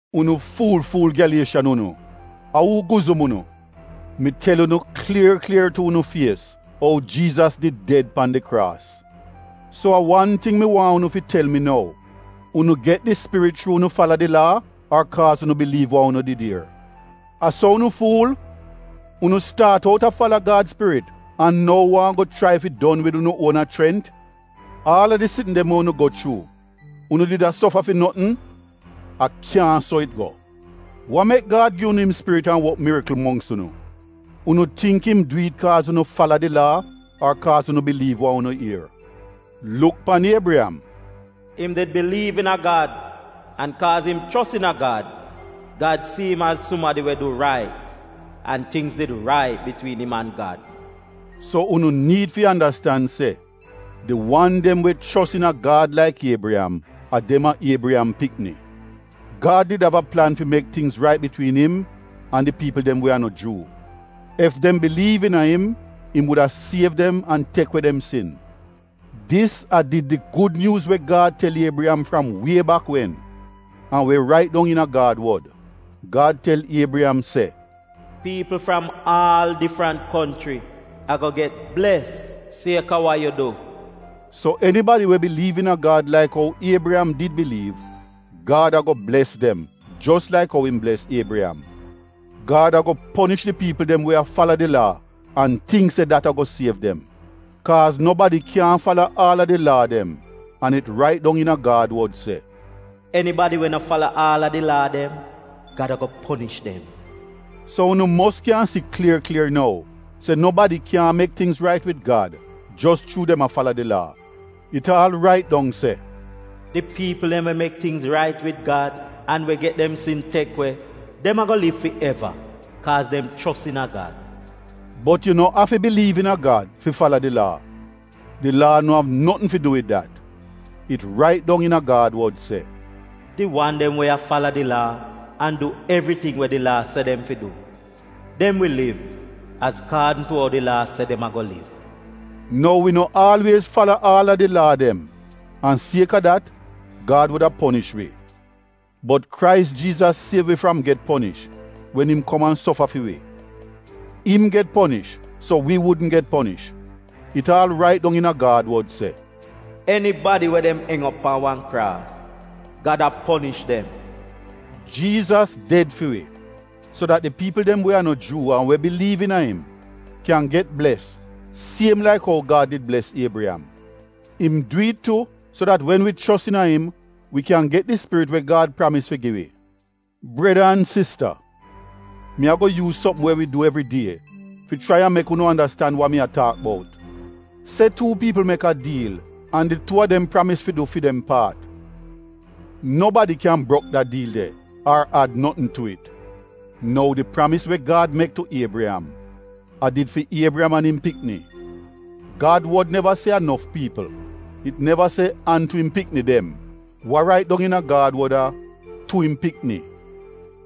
Unu fuul-fuul Gyalieshan unu! A uu guzum unu? Mi tel unu klier klier tu unu fies ou Jiizas did ded pan di kraas. So a wan ting mi waahn unu fi tel mi nou: Unu get di Spirit chuu unu fala di Laa ar kaaz unu biliiv wa unu did ier? A so unu fuul? Unu staat out a fala Gad Spirit an nou waahn go chrai fi don wid unu uona chrent? Aal a di sitn dem we unu go chuu — unu did a sofa fi notn? A kyaahn so it go! Wa mek Gad gi unu im Spirit an wok mirikl mongks unu? Unu tingk im du it kaaz unu fala di Laa ar kaaz unu biliiv wa unu ier? Luk pan Iebriyam, “Im did biliiv iina Gad. An kaaz im chos iina Gad, Gad si im az sumadi we du rait, an tingz did rait bitwiin im an Gad.” So unu niid fi andastan se di wan dem we chos iina Gad laik Iebriyam — a dem a Iebriyam pikni. Gad did av a plan fi mek tingz rait bitwiin im an di piipl dem we a no Juu. Ef dem biliiv iina im, im wuda siev dem an tek we dem sin. Dis a did di gud nyuuz we Gad tel Iebriyam fram wie bak wen an we rait dong iina Gad wod. Gad tel Iebriyam se, “Piipl fram aal difrant konchri ago get bles sieka wa yu du.” So enibadi we biliiv iina Gad laik ou Iebriyam did biliiv — Gad ago bles dem jos laik ou im bles Iebriyam. Gad ago ponish di piipl dem we a fala di Laa an tingk se dat ago siev dem. Kaaz nobadi kyaahn fala aal a di Laa dem an it rait dong iina Gad wod se, “Enibadi we no fala aal a di Laa dem, Gad ago ponish dem.” So unu mos kyan si klier klier nou se nobadi kyan mek tingz rait wid Gad jos chuu dem a fala di Laa. It aal rait dong se, “Di piipl dem we mek tingz rait wid Gad an we get dem sin tek we — dem ago liv fi eva kaaz dem chos iina Gad.” Bot yu no afi biliiv iina a Gad fi fala di Laa, di Laa no av notn fi du wid dat. It rait dong iina Gad wod se, “Di wan dem we a fala di Laa an du evriting we di Laa se dem fi du — dem wi liv azkaadn tu ou di Laa se dem ago liv.” Nou wi no aalwiez fala aal a di Laa dem an sieka dat Gad wuda ponish wi. Bot Krais Jiizas siev wi fram get ponish wen im kom an sofa fi wi. Im get ponish so wi wudn get ponish. It aal rait dong iina Gad wod se, “Enibadi we dem eng op pan wan kraas — Gad a ponish dem.” Jiizas ded fi wi so dat di piipl dem we a no Juu an we biliiv iina im kyan get bles siem laik ou Gad did bles Iebriyam. Im du it tu so dat wen wi chos iina im wi kyan get di Spirit we Gad pramis fi gi wi. Breda an sista, mi ago yuuz sopm we wi du evridie fi chrai an mek unu andastan wa mi taak bout. Se tuu piipl mek a diil an di tuu a dem pramis fi du fi dem paat. Nobadi kyan brok da diil de ar ad notn tu it. Nou di pramis we Gad mek tu Iebriyam, a did fi Iebriyam an im pikni. Gad wod neva se a nof piipl — it neva se “an tu im pikni dem.” Wa rait dong iina Gad wod a “tu im pikni.”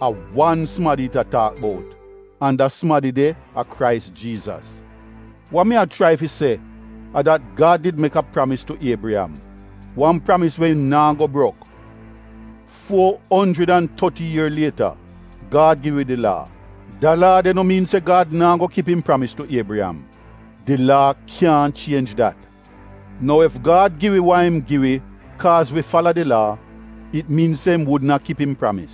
A wan sumadi it a taak bout, an da sumadi de a Krais Jiizas. Wa mi a chrai fi se a dat Gad did mek a pramis tu Iebriyam, wan pramis we im naa go brok. Fuo onjrid an toti ier lieta, Gad gi wi di Laa. Da Laa de no miin se Gad naa go kip im pramis tu Iebriyam. Di Laa kyaahn chienj dat. Nou ef Gad gi wi wa im gi wi kaaz wi fala di Laa — it miin se im wudn a kip im pramis.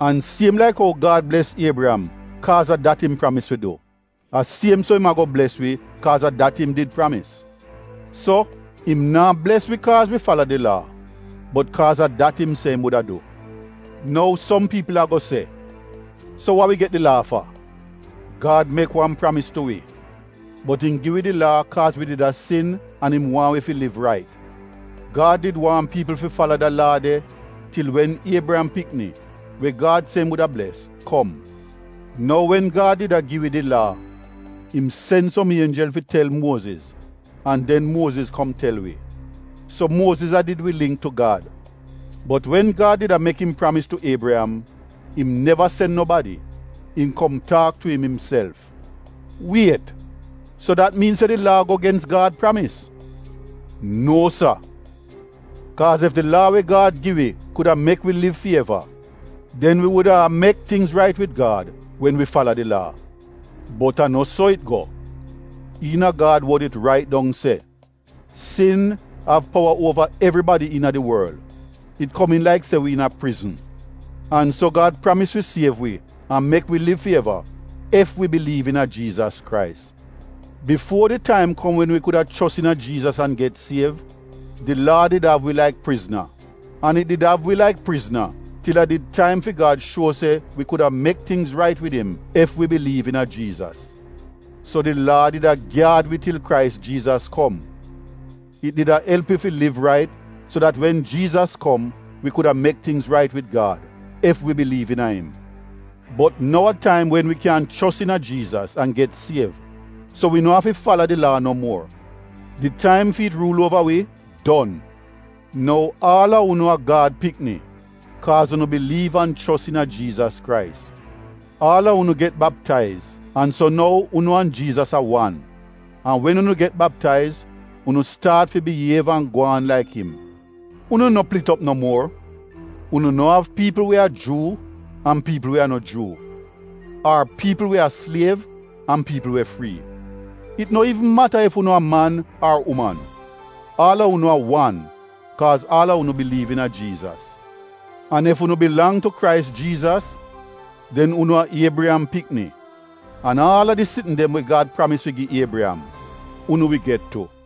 An siem laik ou Gad bles Iebriyam kaaz a dat im pramis fi du, a siem so im ago bles wi kaaz a dat im did pramis. So, im naa bles wi kaaz wi fala di Laa, bot kaaz a dat im se im wuda du. Nou som piipl ago se, “So wa wi get di Laa fa?” Gad mek wan pramis tu wi bot im gi wi di Laa kaaz wi did a sin an im waahn wi fi liv rait. Gad did waahn piipl fi fala da Laa de til wen Iebriyam pikni, we Gad se im wuda bles, kom. Nou wen Gad did a gi wi di Laa — im sen som ienjel fi tel Muoziz an den Muoziz kom tel wi. So Muoziz a did wi lingk tu Gad. Bot wen Gad did a mek im pramis tu Iebriyam, im neva sen nobadi — im kom taak tu im imself. Wiet so dat miin se di Laa a go gens Gad Pramis? No sa! Kaaz ef di Laa we Gad gi wi kuda a mek wi liv fi eva, den wi wuda a mek tingz rait wid Gad wen wi fala di Laa. Bot a no so it go. Iina Gad wod it rait dong se sin av powa uova evribadi iina di worl, it komiin laik se wi iina prizn. An so Gad pramis fi siev wi an mek wi liv fi eva ef wi biliiv iina Jiizas Krais. Bifuo di taim kom wen wi kuda chos iina Jiizas an get siev, di Laa did av wi laik prizna. An it did av wi laik prizna til a did taim fi Gad shuo se wi kuda mek tingz rait wid im ef wi biliiv iina Jiizas. So di Laa did a gyaad wi til Krais Jiizas kom. It did a elp wi fi liv rait so dat wen Jiizas kom wi kuda mek tingz rait wid Gad, ef wi biliiv iina im. Bot nou a taim wen wi kyan chos iina Jiizas an get siev, so wi no afi fala di Laa no muor — di taim fi it ruul uova wi don. Nou aal a unu a Gad pikni kaaz unu biliiv an chos iina Jiizas Krais. Aal a unu get baptaiz, an so nou unu an Jiizas a wan. An wen unu get baptaiz unu staat fi biyiev an gwaan laik im. Unu no plit op no muor. Unu no av piipl we a Juu an piipl we a no Juu ar piipl we a sliev an piipl we frii. It no iivn mata ef unu a man ar uman, aal a unu a wan kaaz aal a unu biliiv iina Jiizas. An ef unu bilang tu Krais Jiizas, den unu a Iebriyam pikni an aal a di sitn dem we Gad pramis fi gi Iebriyam, unu wi get tu.